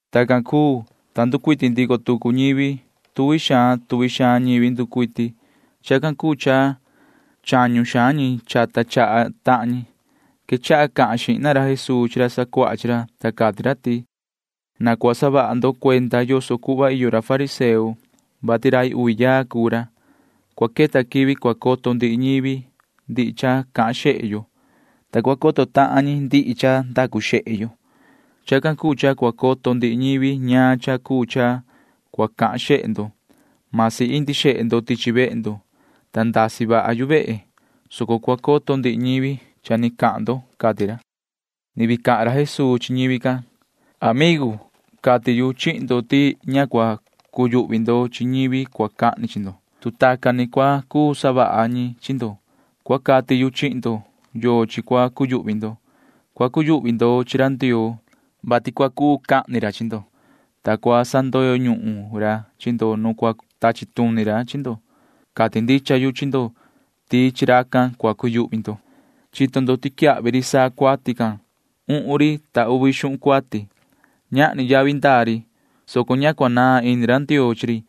Tacan cuu, ta nducuiti ndico tucu ñivi. Tuvi xaan tuvi xaan ñivi nducuiti. Chacan cuu cha chañu xaan ñi chata chaha tahan ñi. Quechaha cahan xihna ra Jesuu chi ra sacuaha chi ra, ta cati ra ti: ―Na cua saha ndo cuenda yoso cuhva iyo ra fariseo, vati rai uvi yaa cuu ra. Cua queta quivi cua coto ndihi ñivi ndihi cha cahan xehe yo, ta cua coto tahan ñi ndihi cha ndacu xehe yo. Chacan cuu cha cua coto ndihi ñivi ñaan cha cuu cha cua cahan xehe ndo. Masi indi xehe ndo tichi vehe ndo, ta ndasi vaha yu vehe, soco cua coto ndihi ñivi cha ni cahan ndo ―cati ra. [Ni vii cahan ra Jesuu chi ñivi can:] ’Amigu, cati yu chihin ndo ti ña cua cuyuhvi ndo chi ñivi cua cahni chi ndo, tu tacan ni cua cuu savaha ñi chi ndo. Cua cati yu chihin ndo yochi cua cuyuhvi ndo. Cua cuyuhvi ndo chi ra Ndioo, vati cua cuu cahni xihna ra chi ndo, ta sa cua sandoyo ñuhun ra chi ndo nu cua tachi tuni ra chi ndo. Cati ndicha yu chi ndo ti chi racan cua cuyuhvi ndo. ’Chito ndo ti quiyahvi ri saa cuati can uhun ri ta uvi xuhun cuati. Ñahni yavi ndaa ri, soco ña cua naan ini ra Ndioo chi ri.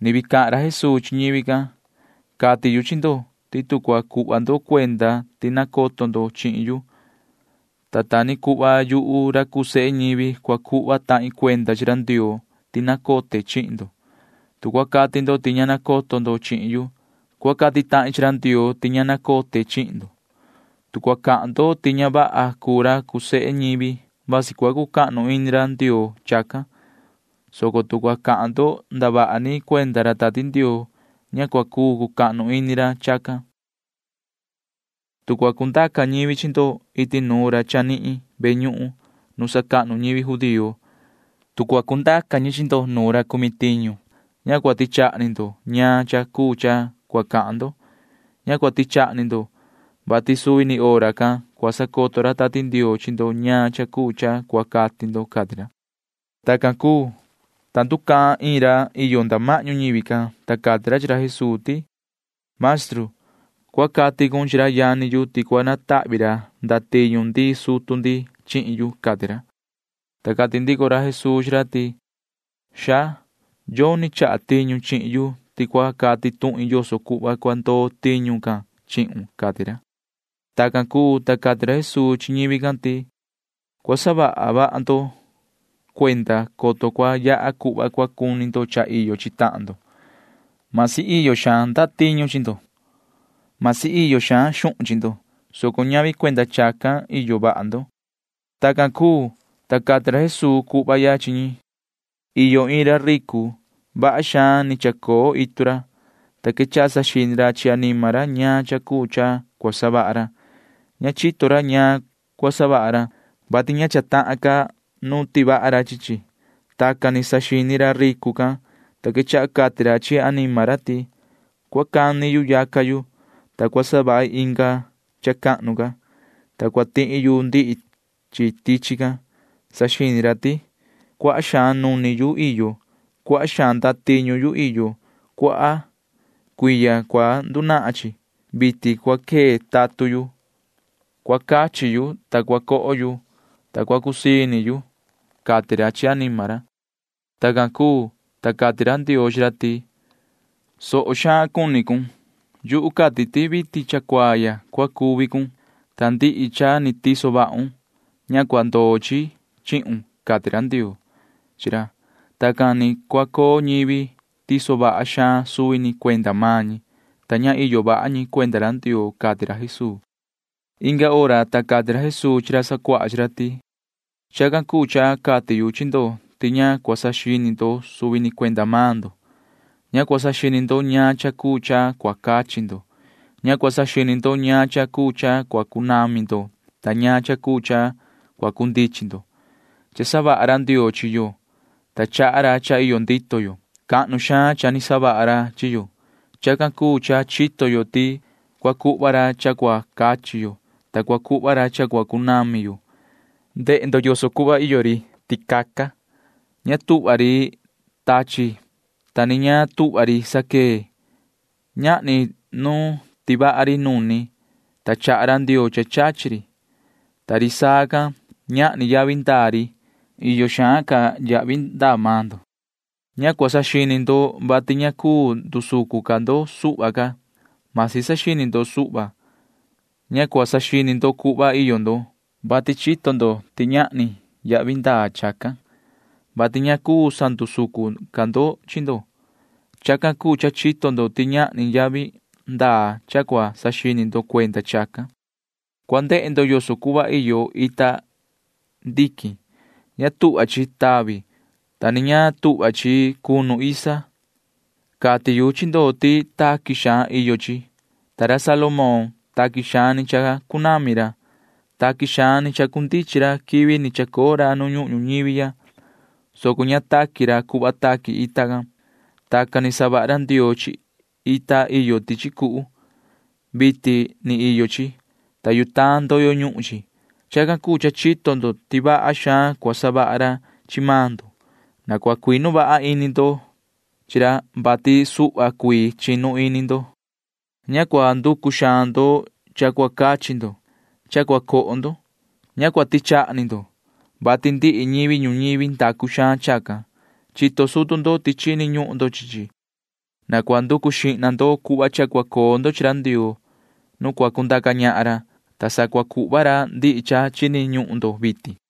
[Ni vii cahan ra Jesuu chi ñivi can:] ’Cati yu chi ndo ti tu cua cuhva ndo cuenda ti nacoto ndo chihin yu, ta ta ni cuhva yuhu ra cuu sehe ñivi cua cuhva tahin cuenda chi ra Ndioo ti nacote chihin ndo. Tu cua cati ndo ti ña nacoto ndo chihin yu, cua cati tahin chi ra Ndioo ti ña nacote chihin ndo. ’Tu cua cahan ndo ti ña vaha cuu ra cuu sehe ñivi, vasi cua cucahnu ini ra Ndioo chacan, soco tu cua cahan ndo ndavaha ni cuenda ra Tati Ndioo, ña cua cuu cucahnu ini ra chacan. ’Tu cua cundaca ñivi chi ndo iti nuun ra chanihin ve ñuhun nu sacahnu ñivi judío, tu cua cundaca ñi chi ndo nu ra cumi tiñu, ña cua tichaha ni ndo ñaan cha cuu cha cua cahan ndo. Ña cua tichaha ni ndo, vati suvi ni hora can cua sacoto ra Tati Ndioo chi ndo ñaan cha cuu cha cua cati ndo ―cati ra. Tacan cuu, ta nducahan iin ra iyo nda mahñu ñivi can, ta cati ra chi ra Jesuu ti: ―Maestru, cua cati cun chi ra yani yu ti cua natahvi ra ndatiñu ndii sutu ndi chihin yu ―cati ra. Ta cati ndico ra Jesuu chi ra ti: ―Hombre, yoni chaha tiñu chihin yu ti cua cati tuhin yoso cuhva cua ndoo tiñu can chihun ―cati ra. Tacan cuu, ta cati ra Jesuu chi ñivi can ti: ―Cua saha vaha ndo cuenda, coto cua yaha cuhva cua cuni ndo cha iyo chi tahan ndo. Vasi iyo xaan ndatiñu chi ndo. Vasi iyo xaan xuhun chi ndo, soco ñavi cuenda chacan iyo vaha ndo. Tacan cuu, ta cati ra Jesuu cuhva ya chi ñi: ―Iyo iin ra ricu. Vaha xaan ni chacoo itu ra, ta quechaha saxini ra chi anima ra ñaan cha cuu cha cua savaha ra. Ña chito ra ñaan cua savaha ra, vati ña cha tahan ca nu tivaha ra chi chi. Tacan ni saxini ra ricu can, ta quechaha cati ra chi anima ra ti: “Cua cani yu yaca yu, ta cua savahi inga cha cahnu ca, ta cua tihi yu ndihi chi tichi can.” Saxini ra ti: “Cuaha xaan nuni yu iyo. Cuaha xaan ndatiñu yu iyo. Cuaha cuiya cua ndunahan chi. Vitin cua quee tatun yu. Cua cachi yu, ta cua coho yu, ta cua cusii ini yu,” cati ra chi anima ra. Tacan cuu, ta cati ra Ndioo chi ra ti: “Tondo xaan xini cun. Yuhu cati ti vitin ya cha cuaa ya cua cuvi cun, ta ndihi cha ni tiso vahun―ña cua ndoo chi chihun,” cati ra Ndioo chi ra. Tacan ni cua coo ñivi tiso vaha xaan suvi ni cuenda maan ñi, ta ña iyo vaha ñi cuenda ra Ndioo ―cati ra Jesuu. Inga hora, ta cati ra Jesuu chi ra sacuaha chi ra ti: ―Chacan cuu cha cati yu chi ndo ti ña cua saxini ndo suvi ni cuenda maan ndo. Ña cua saxini ndo ñaan cha cuu cha cua cachi ndo. Ña cua saxini ndo ñaan cha cuu cha cua cunami ndo ta ñaan cha cuu cha cua cundichin ndo. Cha savaha ra Ndioo chi yo, ta chaha ra cha iyo ndito yo. Cahnu xaan cha ni savaha ra chi yo. Chacan cuu cha chito yo ti cua cuhva ra cha cua cachi yo, ta cua cuhva ra cha cua cunami yo. Ndehe ndo yoso cuhva iyo ri ticaca. Ña tuhva ri tachi, ta ni ña tuhva ri saquee. Ñahni nu tivaha ri nuni, ta chaha ra Ndioo cha chachi ri. Ta ri saa can―ñahni yavi ndaa ri. Iyo xaan ca yavi ndaa maan ndo. Ña cua saxini ndo, vati ña cuu ndusucun ca ndo suhva ca, masi saxini ndo suhva. Ña cua saxini ndo cuhva iyo ndo, vati chito ndo ti ñahni yavi ndaa chacan, vati ña cuu sandusucun ca ndo chi ndo. [Chacan cuu cha chito ndo ti ñahni yavi ndaa cha cua saxini ndo cuenda chacan.] ’Cua ndehe ndo yoso cuhva iyo ita ndiquin. Ña tuhva chi tavi, ta ni ña tuhva chi cunu isa. Cati yu chi ndo ti taqui xaan iyo chi. Ta ra Salomón―taqui xaan ni chacunami ra. Taqui xaan ni chacundichin ra quivi ni chacoo ra nu ñuhun ñuñivi ya, soco ña taqui ra cuhva taqui ita can. Tacan ni savaha ra Ndioo chi ita iyo tichi cuhu. Vitin ni iyo chi, ta yutaan ndoyo ñuhun chi. Chacan cuu cha chito ndo ti vaha xaan cua savaha ra chi maan ndo. Na cua cuinu vaha ini ndo chi ra, vati ña ta cuu vaha. Ña cua nanducu xaan ndo cha cua cachi ndo cha cua coho ndo. Ña cua tichaha ni ndo, vati ndihi ñivi ñuñivi nanducu xaan chacan. Chito sutu ndo ti chini ñuhun ndo chi chi. Na cua nducu xihna ndo cuhva cha cua coo ndo chi ra Ndioo nu cua cundaca ñahan ra, ta sa cua cuhva ra ndihi cha chini ñuhun ndo vitin.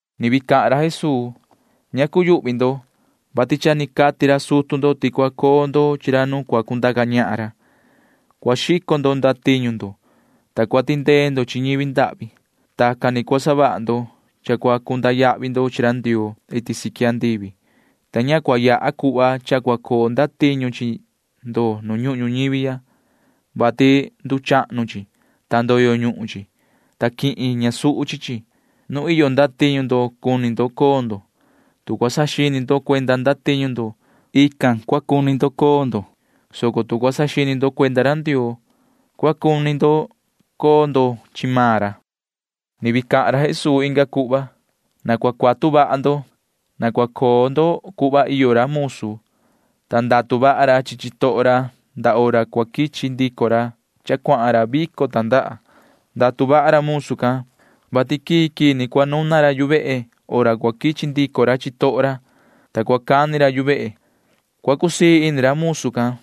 [Ni vii cahan ra Jesuu:] ’Ña cuyuhvi ndo, vati cha ni cati ra sutu ndo ti cua coo ndo chi ra nu cua cundaca ñahan ra. Cua xico ndo ndatiñu ndo, ta cua tindee ndo chi ñivi ndahvi. Tacan ni cua savaha ndo cha cua cunda yahvi ndo chi ra Ndioo iti siqui andivi, ta ña cua yaha cuhva cha cua coo ndatiñu chi ndo nu ñuhun ñuñivi ya, vati nduchahnu chi, ta ndoyo ñuhun chi, ta quihin ñasuhu chi chi. Nu iyo ndatiñu ndo cuni ndo coo ndo. Tu cua saxini ndo cuenda ndatiñu ndo, cua cuni coo ndo chi chi, soco tu cua saxini ndo cuenda ra Ndioo, cua cuni coo ndo chi maan ra. [Ni vii cahan ra Jesuu inga cuhva:] ’Na cua cuatu vaha ndo. Na cua coo ndo cuhva iyo ra musu, ta ndatu vaha ra chi chitoho ra ndaa hora cua quichi ndico ra cha cuahan ra vico tandaha. Ndatu vaha ra musu can, vati quii quii ni cua nuna ra yu vehe hora cua quichi ndico ra chitoho ra, ta cua cani ra yu vehe. Cua cusii ini ra musu can,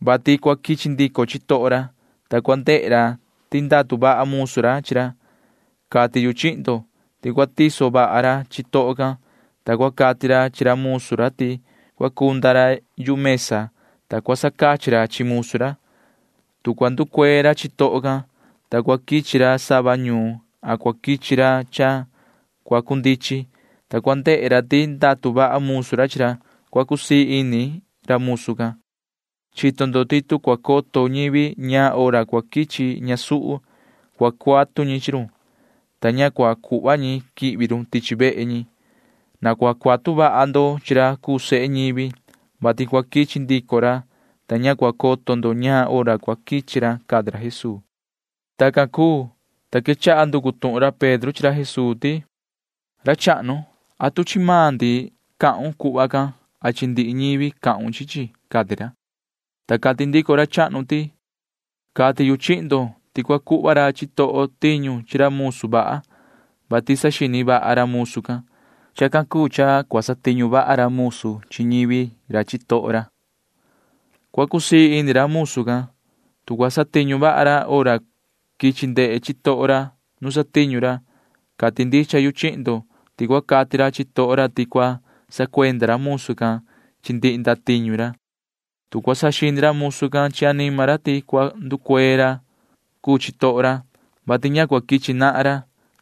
vati cua quichi ndico chitoho ra, ta cua ndehe ra ti ndatu vaha musu ra chi ra. Cati yu chihin ndo ti cua tiso vaha ra chitoho can, ta cua cati ra chi ra musu ra ti cua cunda ra yu mesa, ta cua sacachi ra chi musu ra. Tu cua nducuee ra chitoho can, ta cua quichi ra sava ñuun a cua quichi ra cha cua cundichin, ta cua ndehe ra ti ndatu vaha musu ra chi ra, cua cusii ini ra musu can. Chito ndo ti tu cua coto ñivi ñaan hora cua quichi ñasuhu, cua cuatu ñi chi run, ta ña cua cuhva ñi quihvi run tichi vehe ñi. Na cua cuatu vaha ndo chi ra cuu sehe ñivi, vati cua quichi ndico ra, ta ña cua coto ndo ñaan hora cua quichi ra ―cati ra Jesuu. Tacan cuu, ta quechaha nducu tuhun ra Pedro chi ra Jesuu ti: ―Ra chahnu, ¿atu chi maan ndi cahun cuhva can a chi ndihi ñivi cahun chi chi? ―cati ra. Ta cati ndico ra chahnu ti: ―Cati yu chihin ndo ti cua cuhva ra chitoho tiñu chi ra musu vaha, vati saxini vaha ra musu can. Chacan cuu cha cua satiñu vaha ra musu chi ñivi ra chitoho ra. Cua cusii ini ra musu can, tu cua satiñu vaha ra hora quichi ndehe chitoho ra nu satiñu ra. Cati ndicha yu chihin ndo ti cua cati ra chitoho ra ti cua sacuenda ra musu can chi ndihi ndatiñu ra. Tu cua saxini ra musu can chi anima ra ti cua nducuee ra cuu chitoho ra, vati ña cua quichi nahan ra.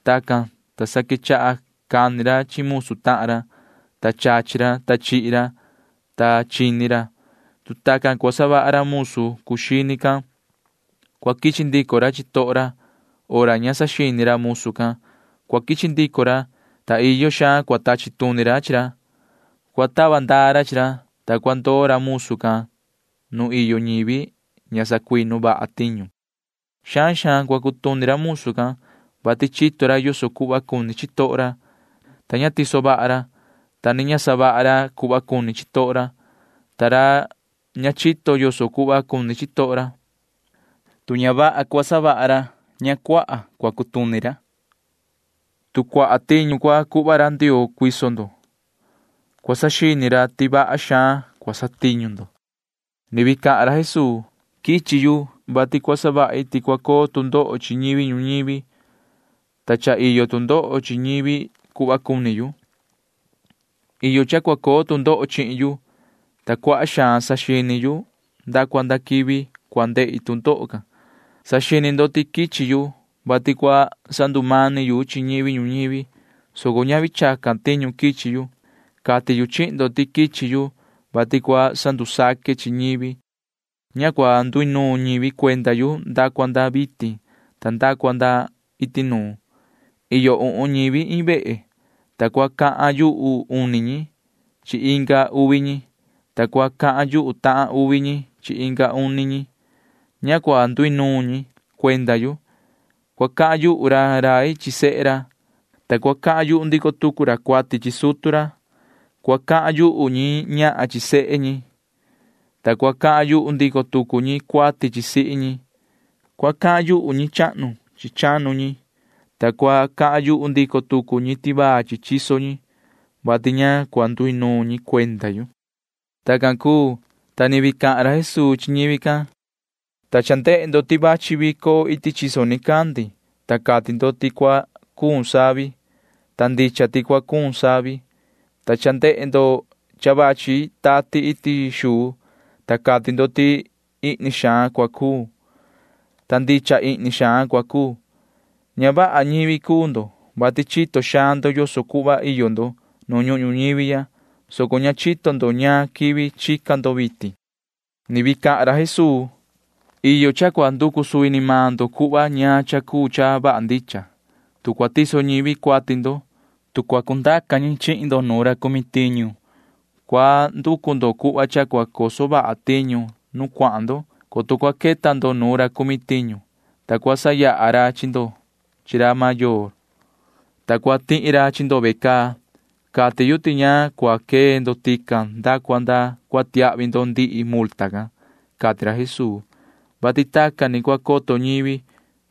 Tacan, ta sa quechaha cani ra chi musu tahan ra, ta chachi ra, ta chihi ra, ta chini ra. Tu tacan cua savaha ra musu cuu xini can, cua quichi ndico ra chitoho ra. Hora ña saxini ra musu can cua quichi ndico ra, ta iyo xaan cua tachi tuni ra chi ra. Cua tava ndaa ra chi ra, ta cua ndoo ra musu can nu iyo ñivi ña sacuinu vaha tiñu. ’Xaan xaan cua cutuni ra musu can, vati chito ra yoso cuhva cuni chitoho ra, ta ña tiso vaha ra, ta ni ña savaha ra cuhva cuni chitoho ra. Ta ra ña chito yoso cuhva cuni chitoho ra―tu ña vaha cua savaha ra, ña cua cutuni xaan ra. Tu cuaha tiñu cua cuhva ra Ndioo cuiso ndo, cua saxini ra ti vaha xaan cua satiñu ndo. [Ni vii cahan ra Jesuu:] ’Quichi yu, vati cua savahi ti cua coo tu ndoho chi ñivi ñuñivi, ta cha iyo tu ndoho chi ñivi cuhva cuni yu. Iyo cha cua coo tu ndoho chihin yu, ta cuaha xaan saxini yu nda cua nda quivi cua ndehi tu ndoho can. Saxini ndo ti quichi yu, vati cua sandumani yu chi ñivi ñuñivi, soco ñavi chacan tiñu quichi yu. Cati yu chihin ndo ti quichi yu, vati cua sandusaque chi ñivi. Ña cua nduinuun ñivi cuenda yu nda cua nda vitin ta nda cua nda iti nuun. Iyo uhun ñivi iin vehe, ta cua cahan yuhu uni ñi chi inga uvi ñi, ta cua cahan yuhu tahan uvi ñi chi inga uni ñi. Ña cua nduinuun ñi cuenda yu. Cua cahan yuhu ra rai chi sehe ra, ta cua cahan yuhu ndico tucu ra cuati chi sutu ra. Cua cahan yuhu ñi ñahan chi sehe ñi, ta cua cahan yuhu ndico tucu ñi cuati chi sihi ñi. Cua cahan yuhu ñi chahnu chi chanu ñi, ta cua cahan yuhu ndico tucu ñi tivaa chi chiso ñi, [vati ña cua nduinuun ñi cuenda yu]. Tacan cuu, ta ni vii cahan ra Jesuu chi ñivi can: ―Ta cha ndehe ndo ti vachi vico iti chiyo chiso nicandi, ta cati ndo ti cua cuun savi, ta ndicha ti cua cuun savi. Ta cha ndehe ndo cha vachi tati iti xuu, ta cati ndo ti ihni xaan cua cuu, ta ndicha ihni xaan cua cuu. Ña vaha ñivi cuu ndo, vati chito xaan ndo yoso cuhva iyo ndo nu ñuhun ñuñivi, soco ña chito ndo ñaan quivi chica ndo vitin. [Ni vii cahan ra Jesuu:] ’Iyo cha cua nducu suvi ni maan ndo cuhva ñaan cha cuu cha vaha ndicha. Tu cua tiso ñivi cuati ndo, tu cua cundaca ñi chi ndo nuun ra cumi tiñu, cua nducu ndo cuhva cha cua coso vaha tiñu nu cuahan ndo, coto cua queta ndo nu ra cale, ta cua sayaha ra chi ndo chi ra mayoo, ta cua tihi ra chi ndo ve caa. Cati yu ti ña cua quee ndo tican nda cua nda cua tiahvi ndo ndihi multa can ―cati ra Jesuu, [vati tacan ni cua coto ñivi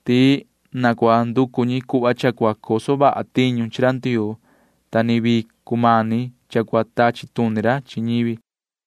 ti na cua nducu ñi cuhva cha cua coso vaha tiñu chi ra Ndioo, ta ni vii cumani cha cua tachi tuni ra chi ñivi].